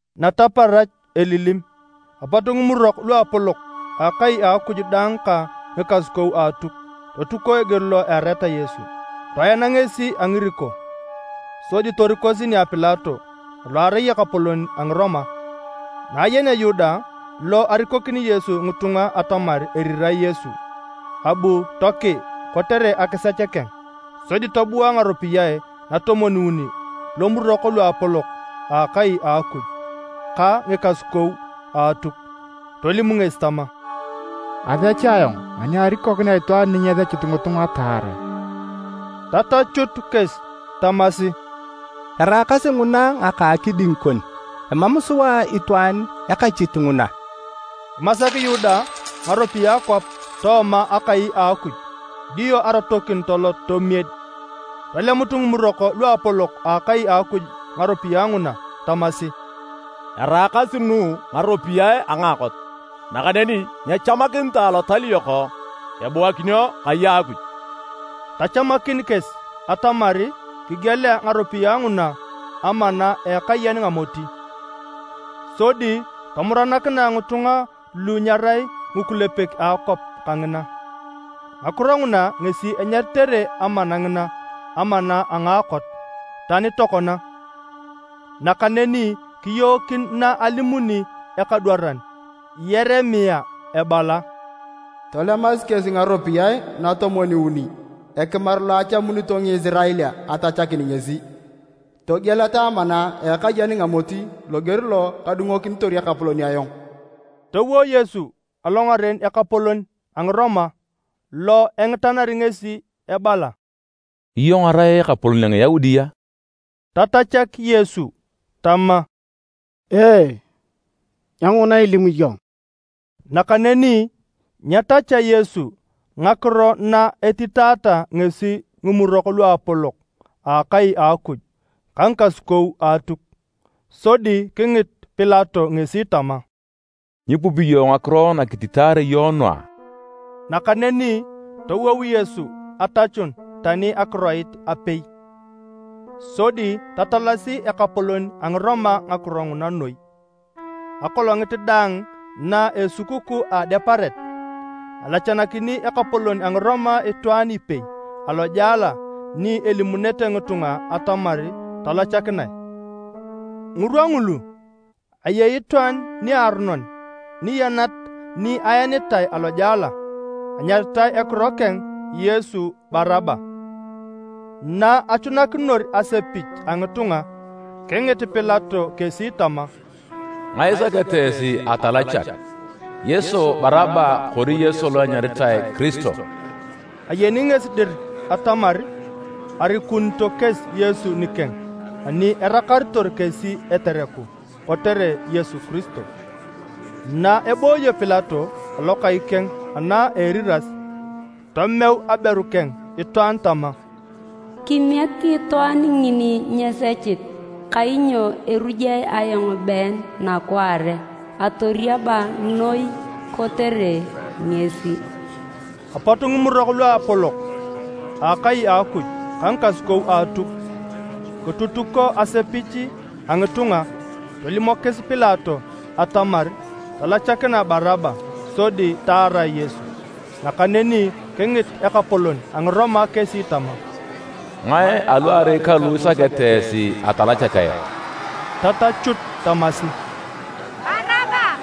Nataparach elilim, apot ngimurok luapolok a akai a Akuj daang ka ngikasukou a Atuk totuko eger lo eareta Yesu. Toena ngesi a ngiriko, sodi torikosi nia Pilato alo arai ekapolon a Ngiroma. Na ayenea Yuda lo arikokini Yesu ngitunga atamar erirae Yesu, abu tokii kotere akisech keng sodi tobua ngaropiyae natomwon-uni lomurok luapolok a akai a Akuj ka ngikasukou a Atuk. Tolim ngesi tama, “Asech ayong ani arikokinea itwaan ni nyesechit ngitunga taarae.” Tatachut kesi tamasi, “Eraakasi nguna ngaka akiding kon, emam sua itwaan ekachit nguna!” Kimasak Yuda ngaropiyae kwap tooma akai a Akuj, dio arotokin tolot tomied. Tolemut ngimurok luapolok a akai a Akuj ngaropiyae nguna tamasi, “Eraakasi nu ngaropiyae a ngaakot, nakaneni nyechamakinitae alotal yok ebuakinio kai a Akuj.” Tachamakin kesi atamar kigielea ngaropiyae nguna Amana a Ekayen Ngamoti, sodi tomuranakinae ngitunga lu nyerai ngikulepek a akwap kangina. Ngakiro nguna ngesi enyaritere amana ngina: “Amana a ngaakot” tani tokona. Nakaneni kiyookin na alimuni ekadwaran Yeremia ebala, “Tolemasi kesi ngaropiyae natomwon-uni (ekimar lo achamunito Ngisirael atachakin ngesi), togieleta amana a ekayen ngamoti, loger lo kadungokinitor Ekapolon ayong.” Towo Yesu alongaren ekapolon a Ngiroma lo engitanari ngesi ebala, “Iyong irai ekapolon a Ngiyaudi a?” Tatachak Yesu tama, “Ee, nyenguna ilimu iyong.” Nakaneni nyetachea Yesu ngakiro na etitaata ngesi ngimurok luapolok a akai a Akuj ka ngikasukou a Atuk. Sodi kingit Pilato ngesi tama, “Nyipupi iyong ngakiro nakititaare iyong nu a?” Nakaneni towou Yesu atachun tani akiroit apei, sodi tatalasi ekapolon a Ngiroma ngakiro nguna noi. Akolongit daang na esukukuu a Adeparet, alachanakini ekapolon a Ngiroma itwaan ipei alojela ni alimunete ngitunga atamar talachakinae. Ngirwa ngulu, ayei itwaan niaronon niyanat ni aenitae alojela, anyaritae ekiro keng Yesu Baraba. Na achunakinor asepich a ngitunga kingit Pilato kesi tama, “Ngae isakete esi atalachak, Yesu Baraba kori Yesu lo enyaritae Kiristo?” Ayeni ngesi dir atamar arikunito kesi Yesu nikeng ani erakaritor kesi etereku kotere Yesu Kiristo. Na ebooyo Pilato alokai keng ana eriras, tomeu aberu keng itwaan tama, “Kimiek itwaan ngini nyesechit, kainyo erujae ayong been nakwaare atoriab noi kotere ngesi.” Apot Ngimurok Luapolok a akai a Akuj ka ngikasukou a Atuk kitutuko asepich a ngitunga tolimokis Pilato atamar talachakinae Baraba sodi taarae Yesu. Nakaneni kingit ekapolon a Ngiroma kesi tama, “Ngae aluarei kalu isakete esi atalachak ayong?” Tatachut tamasi, “Baraba!”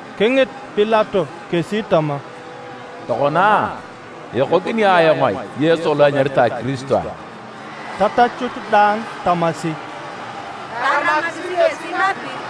Kingit Pilato kesi tama, “Tokona, ekokini ayong Yesu lo enyaritae Kiristo ai?” Tatachut daang tamasi, “Taramakisi ngesi napir!”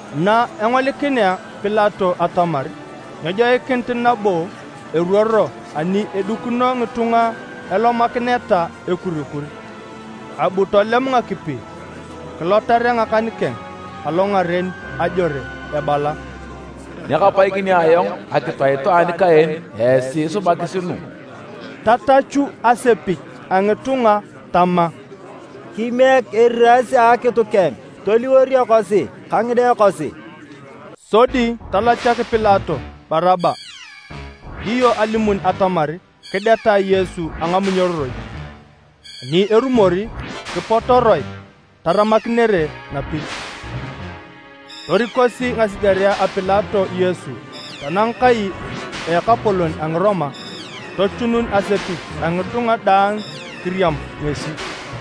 Na engolikinea Pilato atamar nyejoikinit nabo eruoro ani edikino ngitunga elomakineta ekurikur, abu tolem ngakipi kilotarea ngakan keng alongaren ajore ebala, “Nyakapaikinio ayong akitu a itwaan ka en! Esi isubakis nu!” Tatachu asepich a ngitunga tama, “Kimiek eriras a akitu keng toliwor ekosi ka ngide kosi!” Sodi talachak Pilato Baraba, dio alimun atamar kidetae Yesu a ngamunyororoi, ani erumor, kipotoroe taramakinere napir. Torikosi ngasigerea a Pilato Yesu tanang kai a ekapolon a Ngiroma, tochunun asepich a ngitunga daang kiriam ngesi.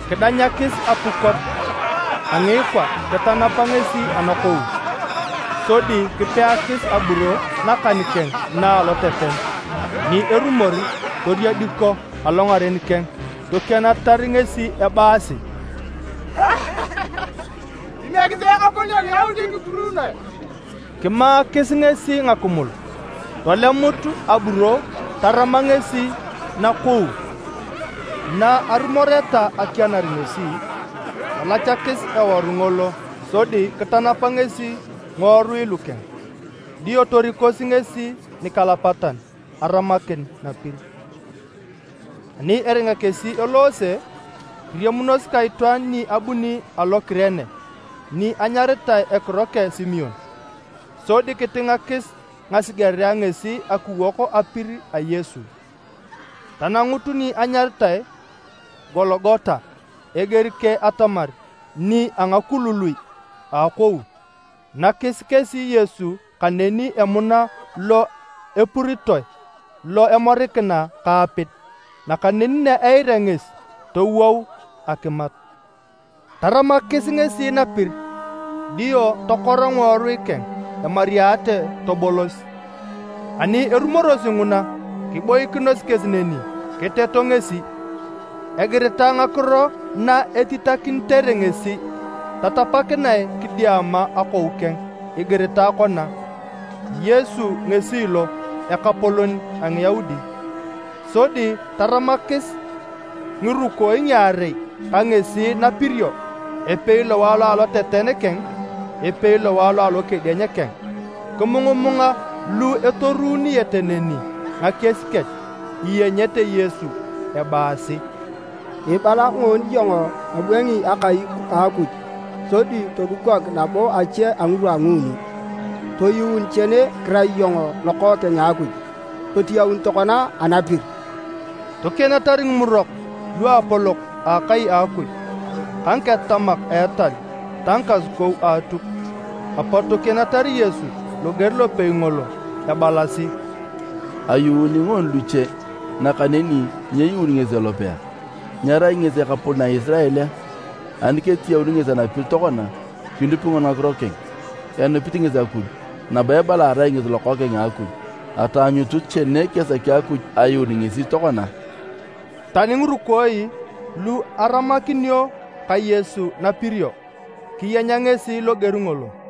Kidanyakis apukot a ngiikwa kitanapa ngesi anakou, sodi kipeakis aburo nakan keng na aloteten, ani erumor toriediko alongaren keng tokienatar ngesi ebaasi, “Kimiekisi Ekapolon a Ngiyaudi kipuruunoe!” Kimaakis ngesi ngakimul, tolemut aburo tarama ngesi nakou. Na arumoreta akianar ngesi, talachasi eworu ngolo sodi kitanapa ngesi ngiworui lukeng. Dio torikosi ngesi nikalapatan aramakin napir. Ani eringa kesi eloose, kiriamunos ka itwaan ni abuni alo Kurene ni enyaritae ekiro keng Simon, sodi kitingakis ngasigerea ngesi akiwok apir a Yesu. Tanangut ni enyaritae Gologota, eger keng atamar, “Nia Akulului a Akou.” Nakis kesi Yesu kaneni emuna lo epuritoe lo imorikina ka apid. Nakaneni na eirea ngesi, towou akimat. Taramakis ngesi napir, dio tokora ngiworui keng emoriate tobolos. Ani erumorosi nguna, kiboikinos kesi neni kiteto ngesi. Egiritae ngakiro na etitakinitere ngesi tatapakinae kidiama akou keng igiritae kona: “Yesu ngesi lo, ekapolon a Ngiyaudi.” Sodi taramakis ngirukooi ngiarei ka ngesi napirio, epei lowae lo aloteten keng, epei lowae lo alokedieny keng. Kimungumunga lu etorununete neni ngakies kech, iyenyete Yesu ebaasi, “Ibala ngoon iyong ibwangi akai a Akuj sodi todukok nabo ache a ngirwa a nguuni! Toyuun chene kirai iyong Lokookeng a Akuj! Totiyaun tokona anapir!” Tokienatar ngimurok luapolok a akai a Akuj ka ngiketatamak a etal ta ngikasukou a Atuk, apot tokienatar Yesu loger lopei ngolo ebalasi, “Ayuuni ngoon luche, nakaneni nyeyuun ngesi elope! Nyerai ngesi ekapolon a Ngisirael a? Ani ketiyaun ngesi anapir tokona, kinupi ngoni ngakiro keng. Enupit ngesi Akuj, nabo ebala arai ngesi Lokookeng a Akuj. Ataanyutu chene kesaki Akuj ayuun ngesi tokona!” Tani ngirukooi lu aramakinio ka Yesu napirio, kiyenya ngesi loger ngolo.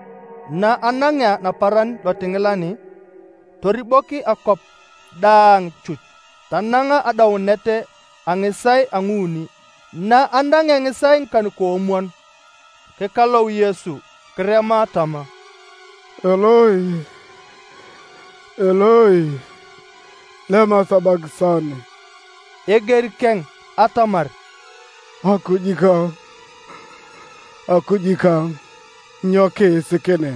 Na anangea naparan lotingilan, toribok akwap daang chuch tanang adaunet a ngisaae a nguuni. Na anangea ngisaae ngikan-koomwon, kikalou Yesu kirema tama, “Eloi, Eloi, lema sabakisani.” Eger keng atamar, “Akuj kang, Akuj kang, nyo kiisikinea?”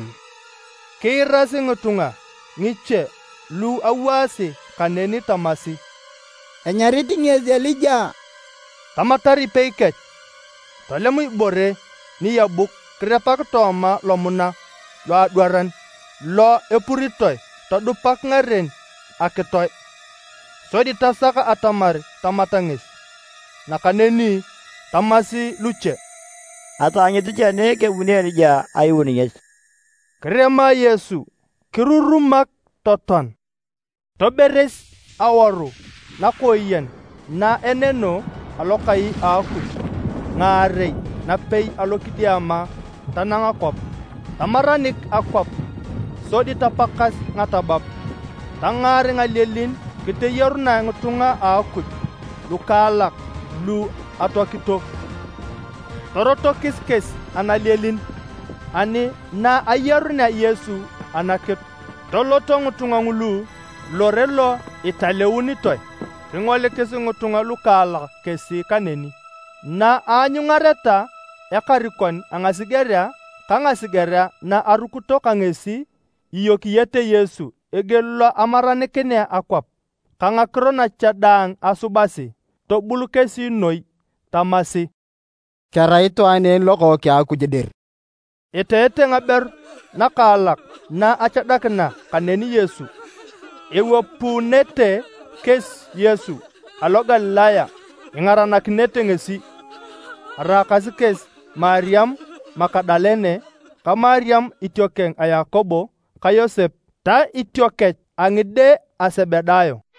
Kiirasi ngitunga ngiche lu awaasi kaneni tamasi, “Enyarit ngesi Elija!” Tamatar ipei kech tolem ibore niyebuk kirepak tooma lomuna loadwaran lo epuritoe todupak ngaren akitoe, sodi tasak atamar tamat ngesi. Nakaneni tamasi luche, “Ataanyutu chene kebuni Elija ayuun ngesi!” Kirema Yesu kirurumak totoan. Toberes awaru nakooyen na eneno alokai a Akuj ngaarei napei alokidiama tanang kwap. Tamaranik akwap sodi tapakas ngatabab. Tangaar ngalielin kiteyarunae ngitunga a Akuj lukaalak lu atoakito. Torotokis kesi analielin, ani na ayarunea Yesu anakitu, toloto ngitunga ngulu Lore Lo italeunitoe, kingolikis ngitunga lukaalak kesi kaneni. Na anyungareta ekarikon a ngasigerea ka ngasigerea na arukito ka ngesi iyokiyete Yesu eger lo amaranikinea akwap, ka ngakiro nache daang asubasi, tobul kesi noi tamasi, “Kerai itwaan en Lokookeng a Akuj dir!” Eteete ngaberu nakaalak na achadakina kaneni Yesu. Ewapuunete kesi Yesu alo Galilaya ingaranakinete ngesi. Araakasi kesi Mariam Magadalene, ka Mariam itiokeng a Yakobo ka Yosep ta itiokech a ngide a Sebedayo.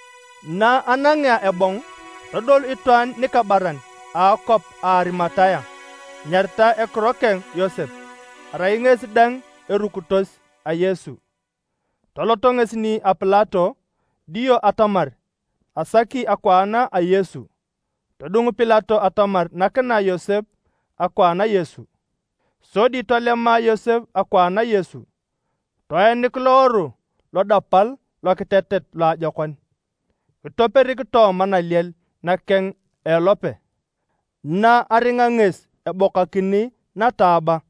Na anangea ebong, todol itwaan nikabaran a akwap a Arimatea enyaritae ekiro keng Yosep, arai ngesi dang erukitos a Yesu. Tolot ngesi nia Pilato dio atamar asaki akwaan a Yesu. Todung Pilato atamar nakinae Yosep akwaan a Yesu. Sodi tolema Yosep akwaan a Yesu, toenik loworu lodapal lokitetet loajokon. Kitoperik tooma naliel nakeng a elope, na aringa ngesi ebokakini nataaba.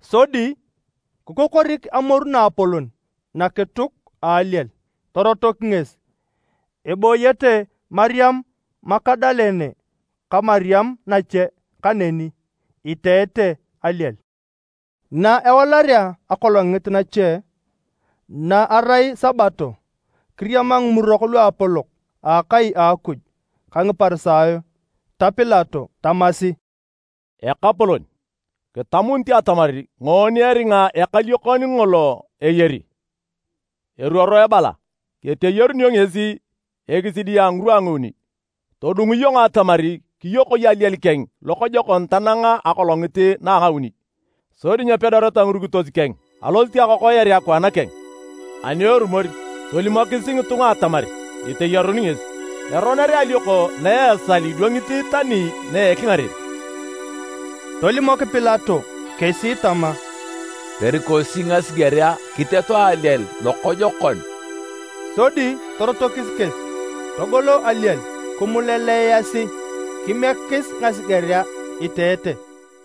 Sodi kikokorik amoru naapolon nakituk a aliel, torotok ngesi. Ebooyete Mariam Magadalene ka Mariam nache kaneni, iteete aliel. Na ewalarea akolongit nache, na erai Sabato kiriama ngimurok luapolok a akai a Akuj ka Ngiparisayo ta Pilato tamasi, “Ekapolon, kitamunit atamar ngoon eringa ekaliokon ngolo eyari, eruoro ebala keteyarunio ngesi ekisidi a ngirwa a nguuni. Todung iyong atamar kiyokoi aliel keng lokojokon tanang akolongit na a ngauni, sodi nyepedoreta ngirukitos keng alosit akokoyar akwaan keng, ani erumor tolimokis ngitunga atamar eteyarun ngesi. Eroner alioko na esal idwangi tani na ekingaren.” Tolimok Pilato kesi tama, “Torikosi ngasigerea kiteto aliel lokojokon.” Sodi torotokis kesi togolo aliel kimuleleasi, kimiekis ngasigerea iteete.